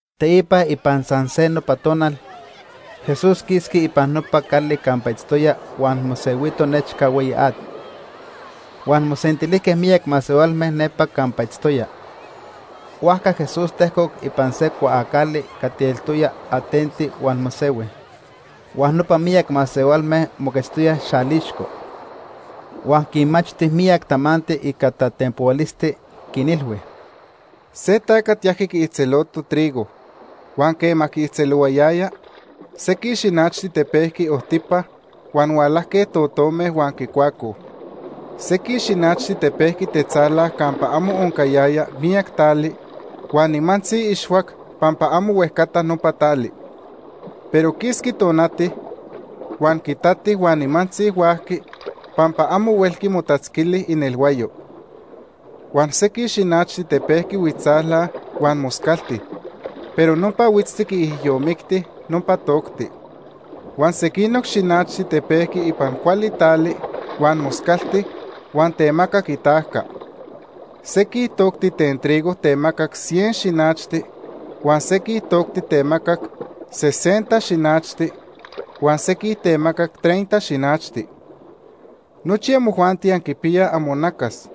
Teipa ipan san se nopa tonal, Jesús quisqui ipan nopa cali campa itztoya huan mosehuito nechca hueyi at. Huan mosentilijque miyac masehualme nepa campa itztoya. Huajca Jesús tejcoc ipan se cuaacali cati eltoya atenti huan mosehui, huan nopa miyac masehualme moquetztoyaj xalixco. Huan quinmachti miyac tamanti ica tatenpohualisti, quinilhui: “Se tacat yajqui quiijtzeloto trigo huan quema quiijtzelohuayaya, sequij xinachti tepejqui ojtipa huan hualajque totome huan quicuacoj. Sequij xinachti tepejqui tetzala campa amo oncayaya miyac tali, huan nimantzi ixhuac pampa amo huejcata nopa tali. Pero quisqui tonati, huan quitati huan nimantzi huajqui, pampa amo huelqui motatzquili inelhuayo. Huan sequij xinachti tepejqui huitztzala huan moscalti, pero nopa huitzti quiijyomicti nopa tocti. Huan sequinoc xinachti tepejqui ipan cuali tali huan moscalti huan temacac itajca. Sequij tocti ten trigo temacac cien xinachti, huan sequij tocti temacac sesenta xinachti, huan sequij temacac treinta xinachti. Nochi amojuanti anquipiyaj amonacas,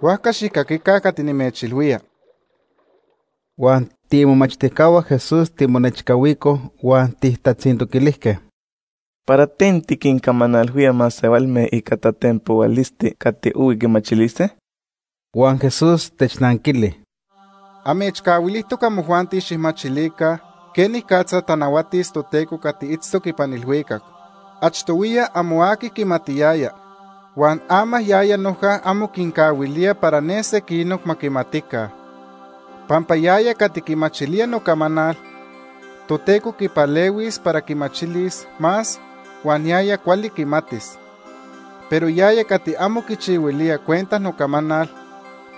huajca xijcaquica cati nimechilhuía.” Huan tiimomachtijcahua Jesús timonechcahuicoj huan tijtatzintoquilijque: “¿Para ten tiquincamanalhuía masehualme ica tatenpohualisti cati ohui quimachilise?” Huan Jesús technanquili: “Amechcahuilijtoc amojuanti xijmachilica quenicatza tanahuatis Toteco cati itztoc ipan ilhuicac. Achtohuiya amo aqui quimatiyaya, huan ama yaya noja amo quincahuilía para ne sequinoc ma quimatica. Pampa yaya cati quimachilía nocamanal, Toteco quipalehuis para quimachilis más huan yaya cuali quimatis. Pero yaya cati amo quichihuilía cuenta nocamanal,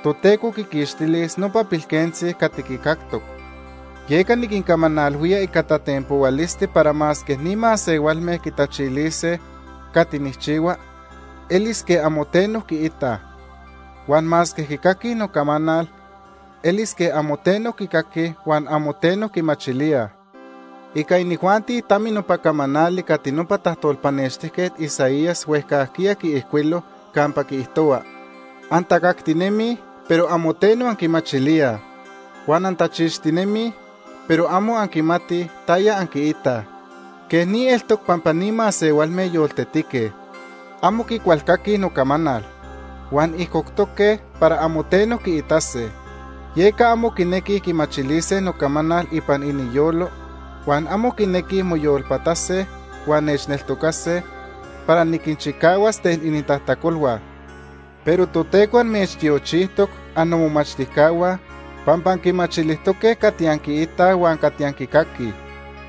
Toteco quiquixtilis nopa pilquentzi cati quicactoc. Yeca niquincamanalhuía ica tatenpohualisti para masque ni masehualme quitachilise cati nijchihua, elis quej amo teno quiitaj. Huan masque quicaquij nocamanal, elis quej amo teno quicaquij huan amo teno quimachilíaj. Ica inijuanti tami nopa camanali cati nopa tajtolpanextijquet Isaías huejcajquiya quiijcuilo, campa quiijtohua: ‘Antacactinemij, pero amo teno anquimachilíaj. Huan antachixtinemij, pero amo anquimatij taya anquiitaj. Quej ni eltoc pampa ni masehualme yoltetique. Amo quicualcaquij nocamanal. Huan ijcoctoque para amo teno quiitase. Yeca amo quinequij quimachilise nocamanal ipan iniyolo, huan amo quinequij moyolpatase huan nechneltocase, para niquinchicahuas ten inintajtacolhua.’ “Pero Toteco amechtiochijtoc, annomomachtijcahua, pampa anquimachilijtoque cati anquiitaj huan cati anquicaquij.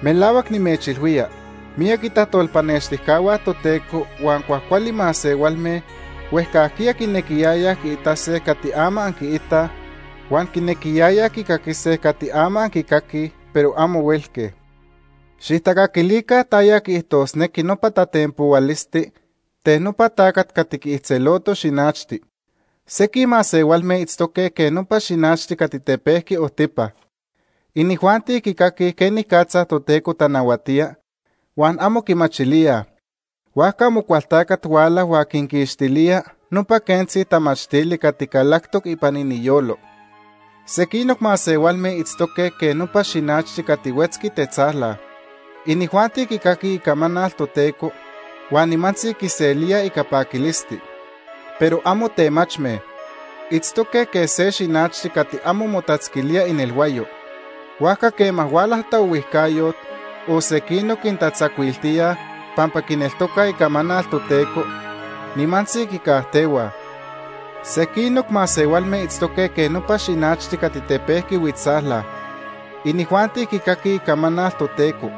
Melahuac nimechilhuía, miyac itajtolpanextijcahua Toteco huan cuajcuali masehualme huejcajquiya quinequiyayaj quiitase cati ama anquiitaj, huan quinequiyayaj quicaquise cati ama anquicaquij, pero amo huelque. “Xijtacaquilica taya quiijtosnequi nopa tatenpohualisti ten nopa tacat cati quiijtzeloto xinachti. Sequij masehualme itztoque quej nopa xinachti cati tepejqui ojtipa. Inijuanti quicaquij quenicatza Toteco tanahuatía huan amo quimachilíaj, huajca Amocualtacat huala huan quinquixtilía nopa quentzi tamachtili cati calactoc ipan iniyolo. Sequinoc masehualme itztoque quej nopa xinachti cati huetzqui tetzala. Inijuanti quicaquij icamanal Toteco huan nimantzi quiselíaj ica paquilisti. Pero amo temachme. Itztoque quej se xinachti cati amo motatzquilía inelhuayo. Huajca quema huala taohuijcayot o sequinoc quintatzacuiltíaj pampa quineltocaj icamanal Toteco, nimantzi quicajtehuaj. Sequinoc masehualme itztoque quej nopa xinachti cati tepejqui huitztzala. Inijuanti quicaquij icamanal Toteco,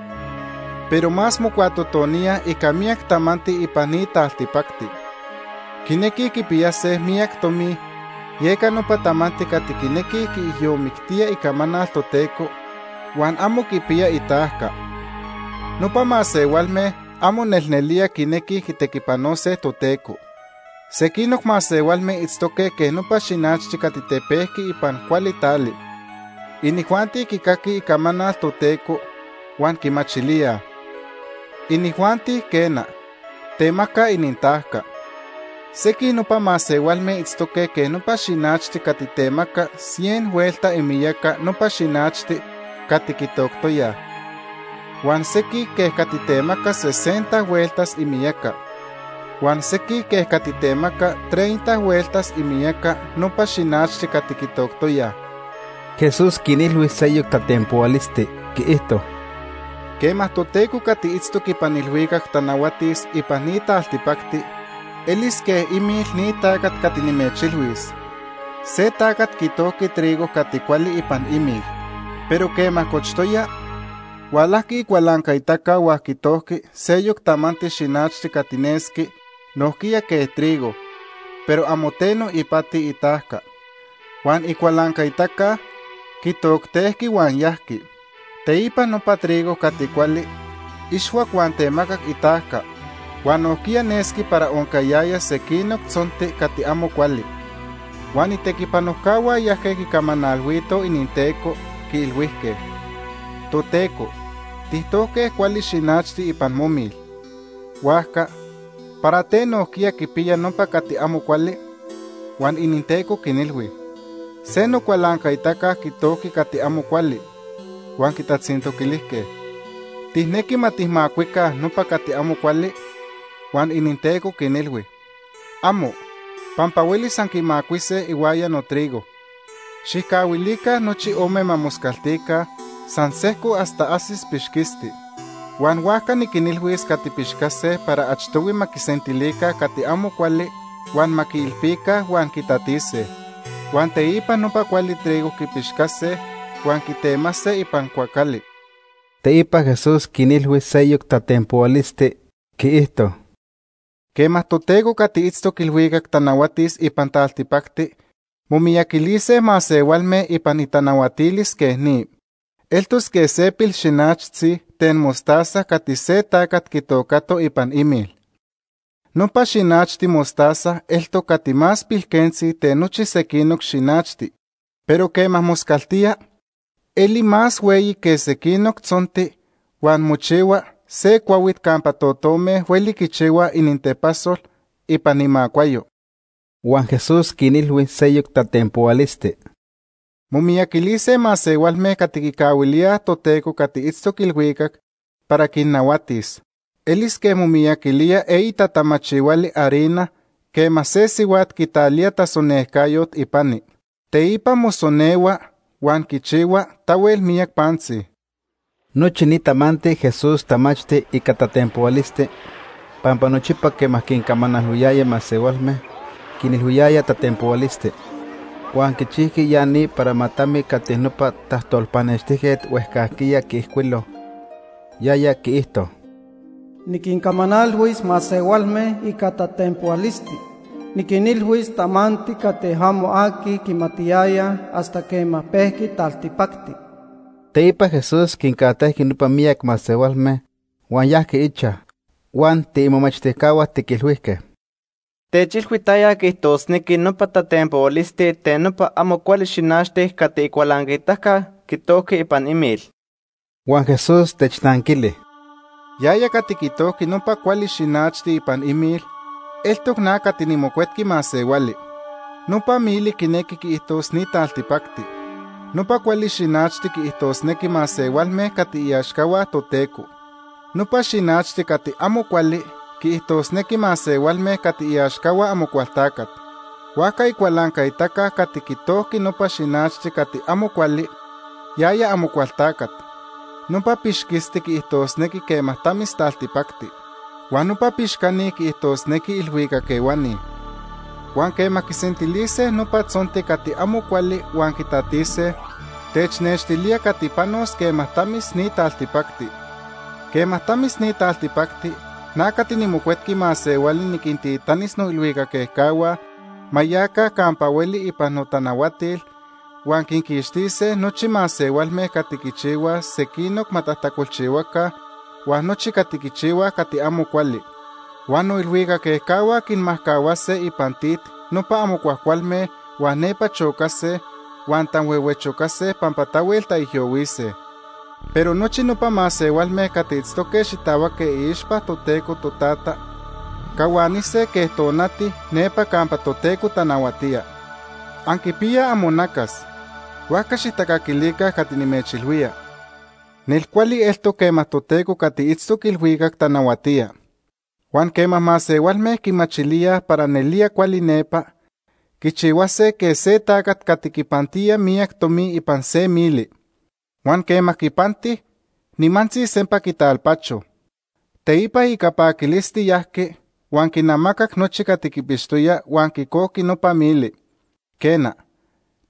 pero más mocuatotoníaj ica miyac tamanti ipan ni taltipacti. Quinequij quipiyase miyac tomi, yeca nopa tamanti cati quinequij quiijyomictíaj icamanal Toteco huan amo quipiya itajca. Nopa masehualme amo nelnelía quinequij quitequipanose Toteco. Sequinoc masehualme itztoque quej nopa xinachti cati tepejqui ipan cuali tali. Inijuanti quicaquij icamanal Toteco huan quimachilíaj. Inijuanti, quena, temacaj inintajca. Sequij nopa masehualme itztoque quej nopa xinachti cati temacac cien hueltas imiyaca nopa xinachti cati quitoctoyaj, huan sequij quej cati temacac sesenta hueltas imiyaca, huan sequij quej cati temacac treinta hueltas imiyaca nopa xinachti cati quitoctoyaj.” Jesús quinilhui seyoc tatenpohualisti, quiijto: “Quema Toteco cati itztoc ipan ilhuicac tanahuatis ipan ni taltipacti, elis quej imil ni tacat cati nimechilhuis. Se tacat quitojqui trigo cati cuali ipan imil. Pero quema cochtoya, hualajqui icualancaitaca huan quitojqui seyoc tamanti xinachti cati nesqui nojquiya quej trigo, pero amo teno ipati itajca. Huan icualancaitaca quitoctejqui huan yajqui. Teipa nopa trigo cati cuali ixhuac huan temacac itajca, huan nojquiya nesqui para oncayaya sequinoc tzonti cati amo cuali. Huan itequipanojcahua yajque quicamanalhuitoj ininteco, quiilhuijque: ‘Toteco, tijtojque cuali xinachti ipan momil. Huajca ¿para ten nojquiya quipiya nopa cati amo cuali?’ “Huan ininteco quinilhui: ‘Se nocualancaitaca quitojqui cati amo cuali.’ “Huan quitatzintoquilijque: ‘¿Tijnequi ma tijmacuica nopa cati amo cuali?’ “Huan ininteco quinilhui: ‘Amo, pampa huelis anquimacuise ihuaya notrigo. Xijcahuilica nochi ome ma moscaltica san sejco hasta ajsis pixquisti. Huan huajca niquinilhuis cati pixcase para achtohui ma quisentilica cati amo cuali huan ma quiilpica huan quitatise. Huan teipa nopa cuali trigo quipixcase huan quitemase ipan cuacali.’” Teipa Jesús quinilhui seyoc tatenpohualisti, quiijto: “Quema Toteco cati itztoc ilhuicac tanahuatis ipan taltipacti momiyaquilise masehualme ipan itanahuatilis quej ni. Eltos quej se pilxinachtzi ten mostaza cati se tacat quitocato ipan imil. Nopa xinachti mostaza eltoc cati más pilquentzi ten nochi sequinoc xinachti, pero quema moscaltía, eli más hueyi que sequinoc tzonti huan mochihua se cuahuit campa totome hueli quichihuaj inintepasol ipan imacuayo.” Huan Jesús quinilhui seyoc tatenpohualisti: “Momiyaquilise masehualme cati quicahuilíaj Toteco cati itztoc ilhuicac para quinnahuatis. Elis quej momiyaquilía eyi tatamachihuali harina quema se sihuat quitalía tasonejcayot ipani. Teipa mosonehua huan quichihua tahuel miyac pantzi.” Nochi ni tamanti Jesús tamachti ica tatenpohualisti, pampa nochipa quema quincamanalhuiyaya masehualme, quinilhuiyaya tatenpohualisti. Huan quichijqui ya ni para ma tami cati nopa tajtolpanextijquet huejcajquiya quiijcuilo. Yaya quiijto: “Niquincamanalhuis masehualme ica tatenpohualisti. Niquinilhuis tamanti cati amo aqui quimatiyaya hasta quema pejqui taltipacti.” Teipa Jesús quincajtejqui nopa miyac masehualme huan yajqui ichaj, huan tiimomachtijcahua tiquilhuijque: “Techilhui taya quiijtosnequi nopa tatenpohualisti ten nopa amo cuali xinachti cati icualancaitaca quitojqui ipan imil.” Huan Jesús technanquili: “Yaya cati quitojqui nopa cuali xinachti ipan imil, eltoc na cati niMocuetqui Masehuali. Nopa mili quinequi quiijtos ni taltipacti. Nopa cuali xinachti quiijtosnequi masehualme cati iaxcahua Toteco. Nopa xinachti cati amo cuali quiijtosnequi masehualme cati iaxcahua Amocualtacat. Huajca icualancaitaca cati quitojqui nopa xinachti cati amo cuali, yaya Amocualtacat. Nopa pixquisti quiijtosnequi quema tamis taltipacti. Huan nopa pixcani quiijtosnequi ilhuicac ehuani. Huan quema quisentilise nopa tzonti cati amo cuali huan quitatise, technextilía cati panos quema tamis ni taltipacti. Quema tamis ni taltipacti, na cati niMocuetqui Masehuali niquintitanis noilhuicac ejcahua ma yaca campa hueli ipan notanahuatil, huan quinquixtise nochi masehualme cati quichihuaj sequinoc ma tajtacolchihuaca huan nochi cati quichihuaj cati amo cuali. Huan noilhuicac ejcahua quinmajcahuase ipan tit nopa amo cuajcualme huan nepa chocase huan tanhuehuechocase pampa tahuel taijyohuise. Pero nochi nopa masehualme cati itztoque xitahuaque iixpa Toteco Totata cahuanise quej tonati nepa campa Toteco tanahuatía. Anquipiyaj amonacas, huajca xijtacaquilica cati nimechilhuía. “Nel cuali eltoc quema Toteco cati itztoc ilhuicac tanahuatía. Huan quema masehualme quimachilíaj para nelía cuali nepa, quichihuase quej se tacat cati quipantía miyac tomi ipan se mili. Huan quema quipanti, nimantzi sempa quitalpacho. Teipa ica paquilisti yajqui huan quinamacac nochi cati quipixtoya huan quicojqui nopa mili. “Quena,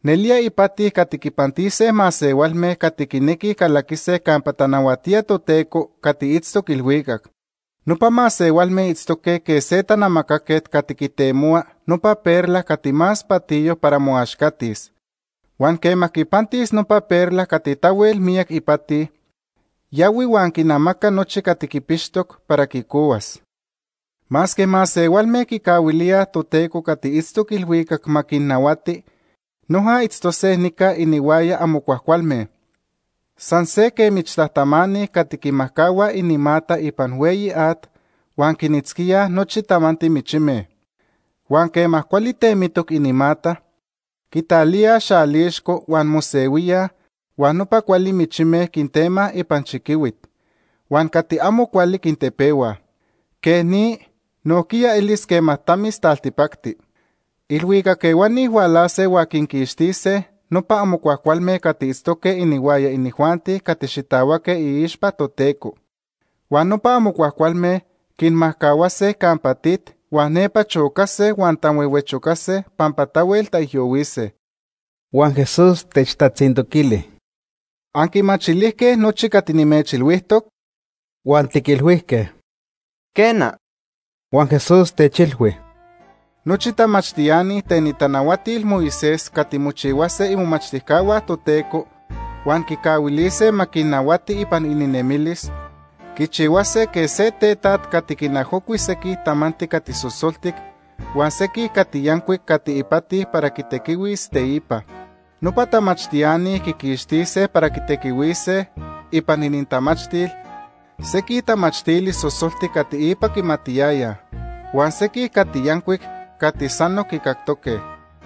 nelía ipati cati quipantise masehualme cati quinequij calaquise campa tanahuatía Toteco cati itztoc ilhuicac. Nopa masehualme itztoque quej se tanamacaquet cati quitemohua nopa perla cati más patiyo para moaxcatis. Huan quema quipantis nopa perla cati tahuel miyac ipati, yahui huan quinamaca nochi cati quipixtoc para quicohuas. “Masque masehualme quicahuilíaj Toteco cati itztoc ilhuicac ma quinnahuati, noja itztose nica inihuaya amo cuajcualme. San se que michtajtamani cati quimajcahuaj inimata ipan hueyi at huan quinitzquíaj nochi tamanti michime. Huan quema cuali temitoc inimata, quitalíaj xalixco huan mosehuíaj huan nopa cuali michime quintemaj ipan chiquihuit huan cati amo cuali quintepehuaj. Quej ni nojquiya elis quema tamis taltipacti. Ilhuicac ehuani hualase huan quinquixtise nopa amo cuajcualme cati itztoque inihuaya inijuanti cati xitahuaque iixpa Toteco. Huan nopa amo cuajcualme quinmajcahuase campa tit huan nepa chocase huan tanhuehuechocase pampa tahuel taijyohuise.” Huan Jesús techtatzintoquili: ―¿Anquimachilijque nochi cati nimechilhuijtoc? Huan tiquilhuijque: ―Quena. Huan Jesús techilhui: ―Nochi tamachtiani ten itanahuatil Moisés cati mochihuase imomachtijcahua Toteco huan quicahuilise ma quinnahuati ipan ininemilis, quichihuase quej se tetaj cati quinajocui sequij tamanti cati sosoltic huan sequij cati yancuic cati ipati para quitequihuis teipa. Nopa tamachtiani quiquixtise para quitequihuise ipan inintamachtil sequij tamachtili sosoltic cati ipa quimatiyayaj huan sequij cati yancuic cati sanoc quicactoque.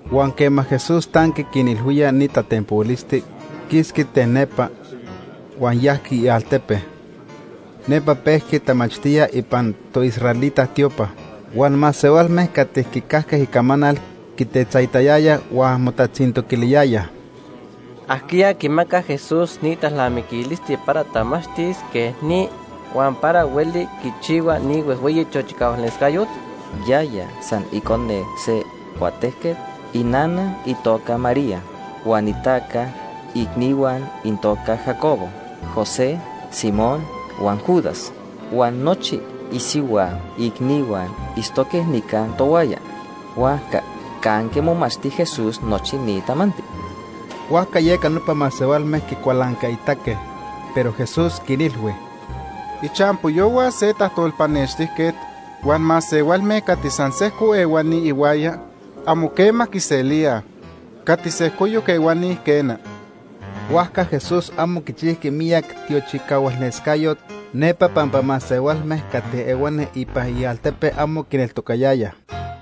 Huan quema Jesús tanqui quinilhuía ni tatenpohualisti, quisqui ten nepa, huan yajqui ialtepe. Nepa pejqui tamachtía ipan toisraelita tiopa. Huan masehualme cati quicajque icamanal quitetzaitayayaj huan motatzintoquiliyayaj: ―¿Ajquiya quimaca Jesús ni talnamiquilisti para tamachtis quej ni, huan para hueli quichihua ni huejhueyi tiochicahualnescayot? Yaya san icone se cuatejquet. Inana itoca María huan itaca icnihua inintoca Jacobo, José, Simón huan Judas. Huan nochi isihua icnihua itztoque nica tohuaya. Huajca ¿canque momachti Jesús nochi ni tamanti? Huajca yeca nopa masehualme quicualancaitaque. Pero Jesús quinilhui: ―Ichampoyohua se tajtolpanextijquet huan masehualme cati san sejco ehuani ihuaya, amo quema quiselíaj. Cati sejcoyoc ehuani, quena. Huajca Jesús amo quichijqui miyac tiochicahualnescayot nepa pampa masehualme cati ehuani ipan ialtepe amo quineltocayayaj.